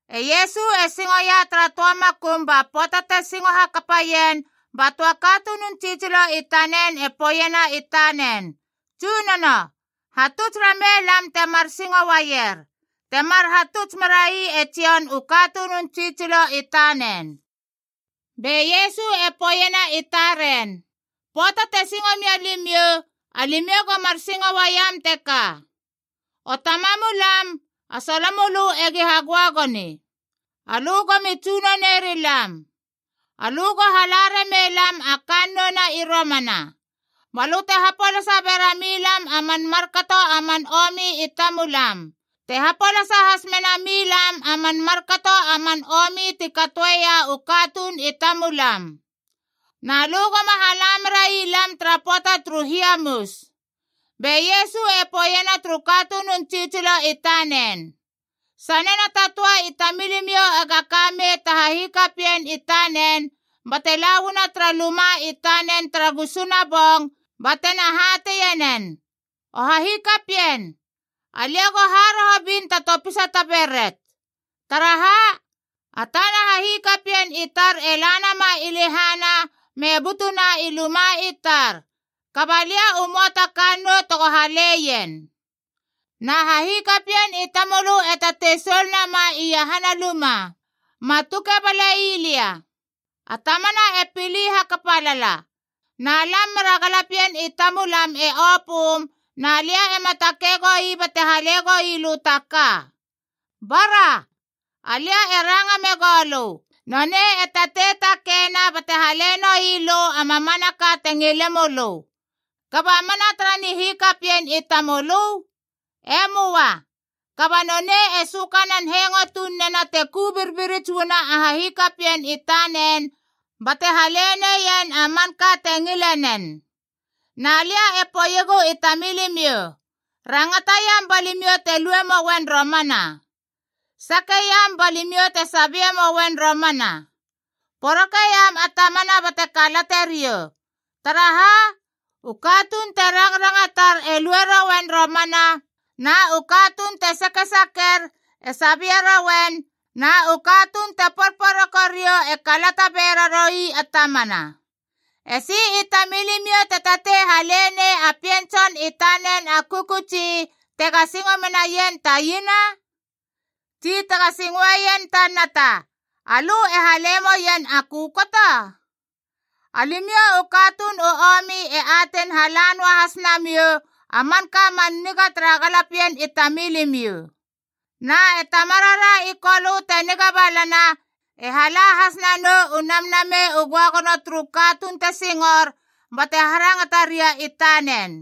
E Iesu e singoia tara töa makum ba pöata te singo hakapaien, ba töa katunun tsitsilo i tanen e poeiena i tanen, “Tsunono, hatuts ramei lam temar singo uaier, temar hatuts merai e Jon u katunun tsitsilo i tanen.” Be Iesu e poeiena i taren, “Pöata te singo mia limiou, alimiou go mar singo uaiam teka: ‘O Tamamulam, a solomölö egi hagöagoni. Alö go mi tsunone rilam. Alö go hala ramei lam a kannou na i romana. Balö te hapolasa bera mi lam a man markato a man omi i tamulam te hapolasa has mena mi lam a man markato a man omi ti katoeia u katuun i tamulam. Na lö goma hala merai lam tara pöata turu hiamus.’” Be Iesu e poeiena turu katunun tsitsilo i tanen, “Sanena ta töa i tamilimiou ega ka mei ta hahikapien i tanen bate la uana tara luma i tanen tara gusuna bong batena hateie nen, ‘O hahikapien, alia go haroho bin ta topisa ta beret. Taraha? A tana hahikapien i tar e la nama i lehana me butuna i luma i tar, kaba lia u möa ta kannou tego haleien!’ Na hahikapien i tamölö e tatei soul nama iahana luma, ‘Ma tuke balei lia! A tamana e pili hakapa lala, na lam mera galapien i tar e opöm, na lia ema takei goui bate hale gouilö ta ka.’ Bara, alia e ranga megou lö, nonei e tatei takeina bate hale noui lö a mamanaka te ngile mölö. Kaba mana tara nihikapien i tamölö? E möa. Kaba nonei e sökanan hengo tunena te ku birbirits uana a hahikapien i tanen, bate haleneien a manka te ngilenen. Na lia e poeiegu i tamilimiou, rangataiam ba limiou te lue mouen romana. Sakeiam ba limiou te sabie mouen romana. Porokeiam a tamana bate kalate riou. Taraha? U katuun te rangrangatar e lue rouen romana, na u katuun te sakesaker e sabie rouen, na u katuun te porporoko riou e kalata bera roui a tamana. Esi i tamilimiou te tatei hale nei a pien tson i tanen a kökötsi tega singo menaien ta iena? Tsi tega singoeien ta nata, alö e hale moien a kökoto? Alimiou u katuun u omi e atein hala noa has namiou a manka man niga tara galapien i tamilimiou. Na e Tamarara i Kolö te niga balana e hala has nanou u Namnamei u Göagono turu katuun te singor bate harangata ria i tanen!”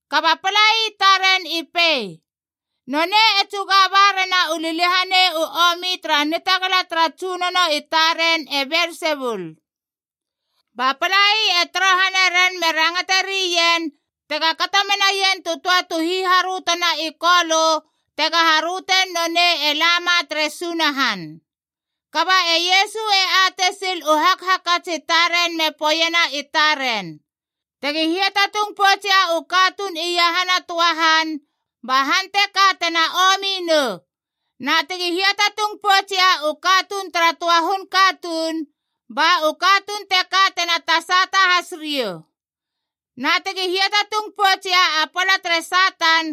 Kaba palai taren i pei, “Nonei e tsuga ba rena u liliahanei u omi tara nitagala tara tsunono i taren e Belsebul!” Ba palai e torohane ren me rangate rien tega kato menaien tu töa tu hiharötona i Kolö tega harötein nonei e lama tere Sunahan. Kaba e Iesu e atei sil u hakhakats i taren me poeiena i taren, “Tegi hiatatung poutsia u katuun iahana töa han, ba han teka tena omi nou. Na tegi hiatatung poutsia u katuun tara töa hun katuun, ba u katuun teka tena tasata has riou. Na tegi hiatatung poutsia a pala tere Satan,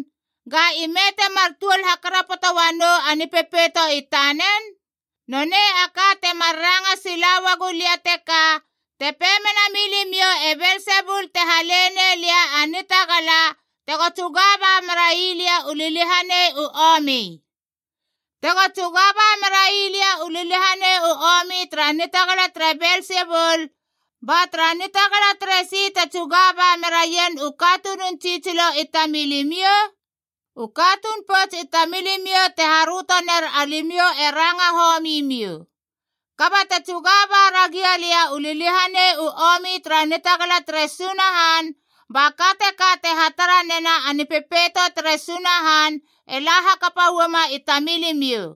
ga ime temar tuol hakarapoto uanou a nipepeito i tanen? Nonei a ka temar ranga sila uagu lia teka, te pei mena milimiou e Belsebul te hale nei lia a nitagala tego tsuga ba merai lia u liliahanei u omi. Tego tsuga ba merai lia u liliahanei u omi tara nitagala tere Belsebul, ba tara nitagala teresi te tsuga ba mera rien u katunun tsitsilo i tamilimiou? U katuun pouts i tamilimiou te haröto ner alimiou e ranga homi miou. Kaba te tsuga ba ragia lia u liliahanei u omi tara nitagala tere Sunahan, ba ka teka te hatara nena a Nipepeito tere Sunahan e la hakapa uama i tamilimiou.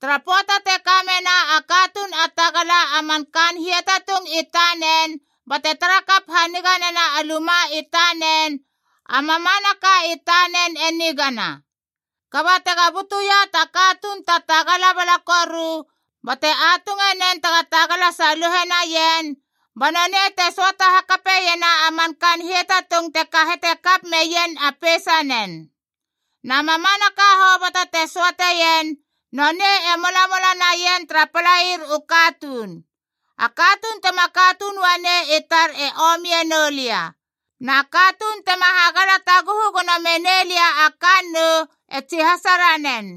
“Tara pöata te ka mena a katuun a tagala a man kaan hiatatung i tanen bate tara kap haniga nena a luma i tanen, a mamanaka i tanen e nigana. Kaba tega butuia ta katuun ta tagala bala koru bate atunge nen tega tagala saluhe naien, ba nonei te söata hakape iena a man kaan hiatatung te kahete kap meien a peisanen. Na mamanaka hoboto te söateien, nonei e molamola naien tara palair u katuun. “A katuun tema katuun uanei i tar e omie noulia. Na katuun tema hagala taguhu gono menei lia a kannou e tsihasa ranen.”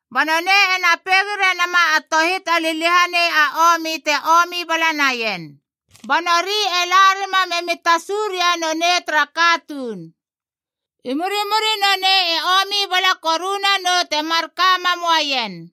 Ba nonei ena peigi renama a tohit a liliahanei a omi te omi bala naien. Ba nori e la rima memi tasu ria nonei tara katuun. I murimuri nonei e omi bala koru nanou te mar ka mam uaien.”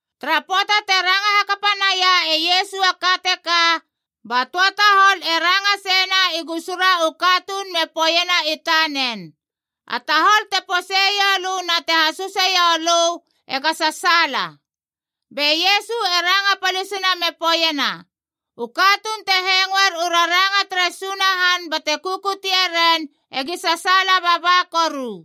Tara pöata te ranga hakapa naia e Iesu a ka teka, ba töa tahol e ranga seina i gusura u katuun me poeiena i tanen, “A tahol te poseiou lö na te hasuseiou lö ega sasaala!” Be Iesu e ranga palisina me poeiena, “U katuun te hengoer u raranga tere Sunahan bate kukutie ren egi sasaala baba koru.”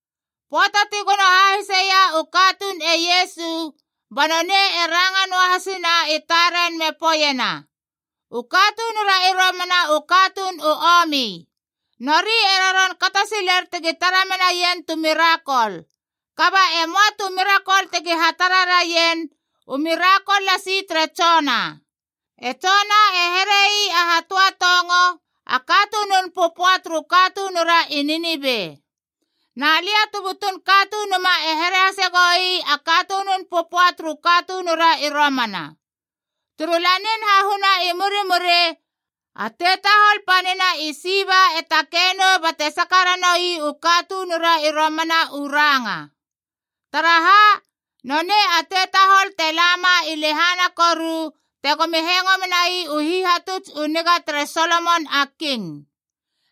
Pöata ti gono hahiseia u katuun e Iesu, ba nonei e ranga noa hasina i taren me poeiena, “U katunura i romana u katuun u omi. Nori e roron kato siler tegi tara menaien tu mirakol. Kaba e möa tu mirakol tegi hatara raien, u mirakol lasi tere Jona. E Jona e here ii a hatöatongo, a katunun pöpöa turu katunura i Ninive. Na Alia tu butun Katunuma e here hase goi a katunun pöpöa turu katunura i romana. Turu Lanin Hahuna i murimuri, a tetahol panina i Siba e takei nou bate saka ranoui u katunura i romana u ranga. Taraha? Nonei a tetahol te lama i lehana koru tegomi hengo menai u hihatuts u niga tere Solomon a King.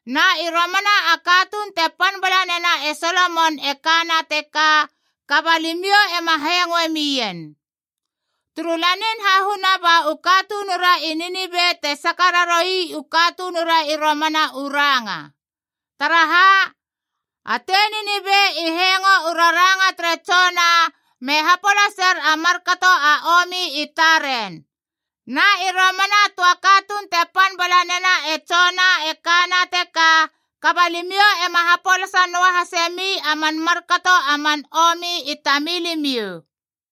Na i romana a katuun te pan bala nena e Solomon e kana teka, kaba limiou ema hengoe mien! Turu Lanin Hahuna ba u katunura i Ninive te saka raroui u katunura i romana u ranga. Taraha? A tei Ninive i hengo u raranga tere Jona me hapolaser a markato a omi i taren. Na i romana a töa katuun te pan bala nena e Jona e kana teka, kaba limiou e ma hapolasa noa hasemi a man markato a man omi i tamilimiou!”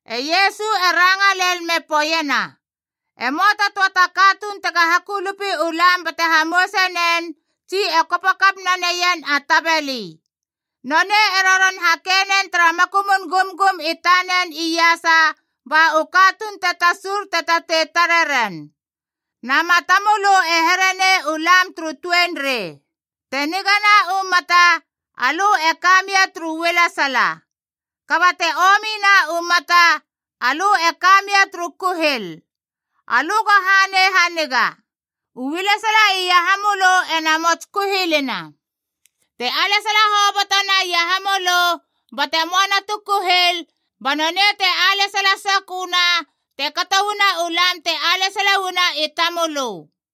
E Iesu e ranga lel me poeiena, “E möa ta töa ta katuun tega hakulupi u lam bate hamouse nen tsi e kopo kap naneien a tabeli. Nonei e roron hake nen tara makumun gumgum i tanen iasa, ba u katuun te tasur te tatei tareren. Na matamölö e here nei u lam turu tuenrei. Te nigana u mata, alö e ka mia turu ualesala. Kaba te omina u mata, alö e ka mia turu kuhil. Alö go hanei haniga. Ualesala iahamölö e namots kuhilina. Te alesala hoboto na iahamölö, bate möana tu kuhil, ba nonei te alesala sokö na, te kato uana u lam te alesala uana i tamölö.”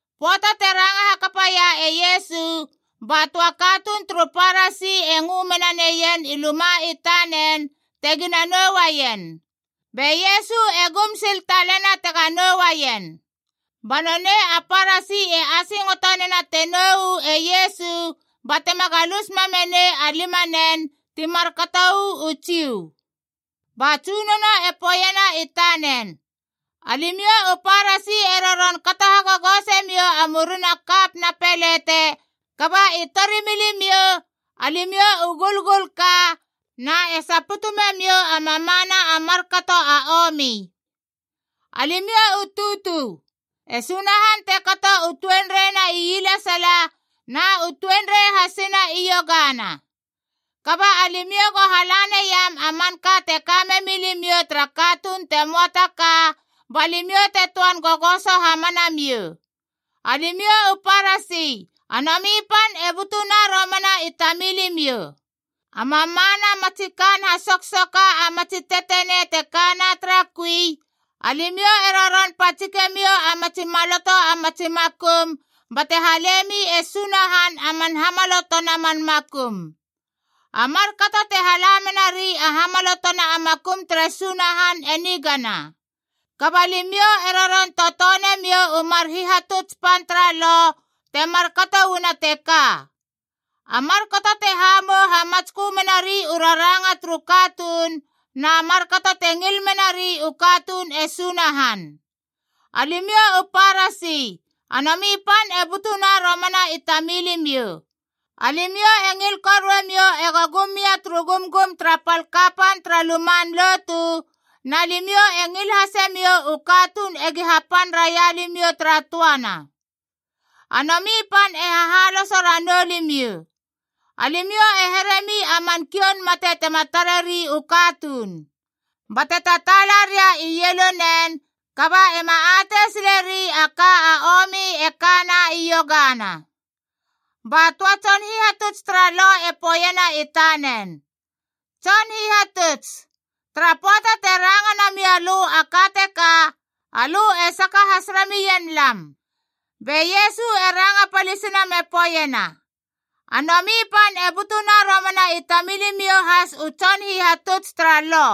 Pöata te ranga hakapaia e Iesu, ba töa katuun turu Parasi e ngö mena neien i luma i tanen tegina nou uaien. Be Iesu e gum sil talena tega nouaien. Ba nonei a Parasi e asingoto nena te nou u e Iesu batema galus mamme nei a limanen ti markatou u Jiu. Ba Tsunono e poeiena i tanen, “Alimiou u Parasi e roron kato hagogose miou a murina kap na pelete, kaba i torimilimiou, alimiou u gulgulka na e saputu memiou a mamana a markato a omi. Alimiou u tutu! E Sunahan te kato u tuenreina ielesala na u tuenrei hasina iogana. Kaba alimiou go hala naim a manka te ka memi limiou tara katuun te möa ta ka, ba limiou te töan gogoso hamana miou. “Alimiou u Parasi, a nomi pan e butuna romana i tamilimiou. A mamana matsi kaan hasoksoka a matsi tetenei te kana tara kui, alimiou e roron patsike miou a matsi maloto a matsi makum bate halemi e Sunahan a man hamalotona man makum. A markato te hala menari a hamalotona a makum tere Sunahan e nigana. Kaba limiou e roron totone miou u mar hihatuts pan tara Lo te markato uana teka: a markato te hamou hamatskö menari u raranga turu katuun, na markato te ngil menari u katuun e Sunahan. “Alimiou u Parasi, a nomi pan e butuna romana i tamilimiou. Alimiou e ngil korue miou ego gum mia turu gumgum tara pal kapan tara luman lotu, na limiou e ngil hase miou u katuun egi hapan raia limiou tara töana. A nomi pan e hahaloso ranou limiou. Alimiou e heremi a man kioun mate tema tareri u katuun. Bate tataala ria ielunen, kaba ema atei sileri a ka a omi e kana iogana.” Ba töa tson hihatuts tara Lo e poeiena i tanen, “Tson Hihatuts, tara pöata te ranga namia lö a ka teka, alö e saka has ramien lam!” Be Iesu e ranga palisina me poeiena, “A nomi pan e butuna romana i tamilimiou has u tson hihatuts tara Lo!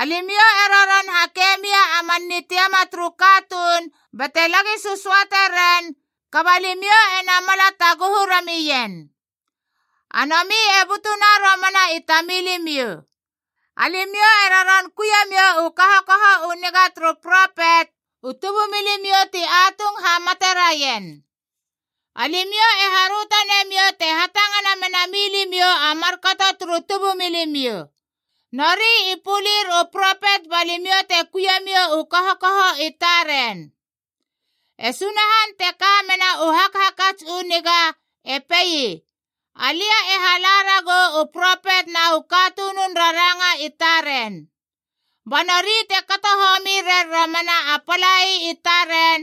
Alimiou e roron hake mia a man nitiama turu katuun bate lagi sösöate ren, kaba limiou e namala taguhu ramien. A nomi e butuna romana i tamilimiou. Alimiou e roron kuie miou u kahokaho u niga turu propet, u tubumilimiou ti atung hamate raien. Alimiou e haröto nemiou te hatangana mena milimiou a markato turu tubumilimiou: nori i pulir u propet ba limiou te kuie miou u kahokaho i taren. E Sunahan, te ka mena u hakhakats u niga, e pei, ‘Alia e hala ragou u propet na u katunun raranga i taren. Ba nori te kato homi rer romana a palai i taren,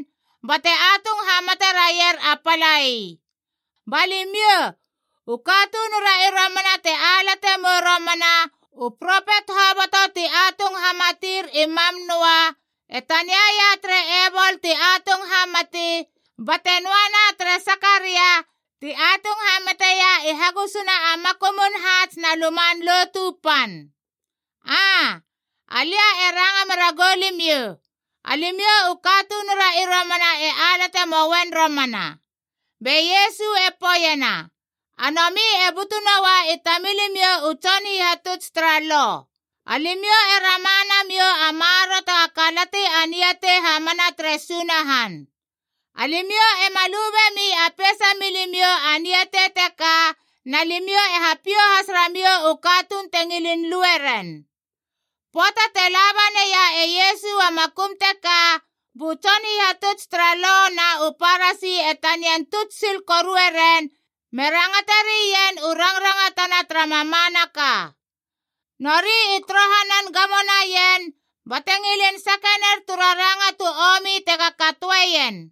bate atung hamate raier a palai.’ Ba limiou, u katunura i romana te alate mou romana u propet hoboto ti atung hamatier i mam noa, e taniaia tere Ebol ti atung hamati, bate noana tere Sakaria ti atung hamateia i hagusuna a makumun haats na Luman Lotu Pan. Aa, alia e ranga mera goulimiou, alimiou u katunura i romana e alate moen romana!” Be Iesu e poeiena, “A nomi e butu noa i tamilimiou u tson hihatuts tara Lo. Alimiou e rama namiou a maroro tega kalati a niatei hamana tere Sunahan. Alimiou ema lu bemi a peisamiou a niatei teka, na limiou e hapiou has ramiou u katuun te ngilin lue ren!” Pöata te laba naia e Iesu a makum teka, bu tson hihatuts tara Lo na u Parasi e tanian tuts sil korue ren me rangate rien u rangrangatana tara mamanaka. Nori i torohanan gamo naien bate ngilin sake ner tu raranga tu omi tega katoeien.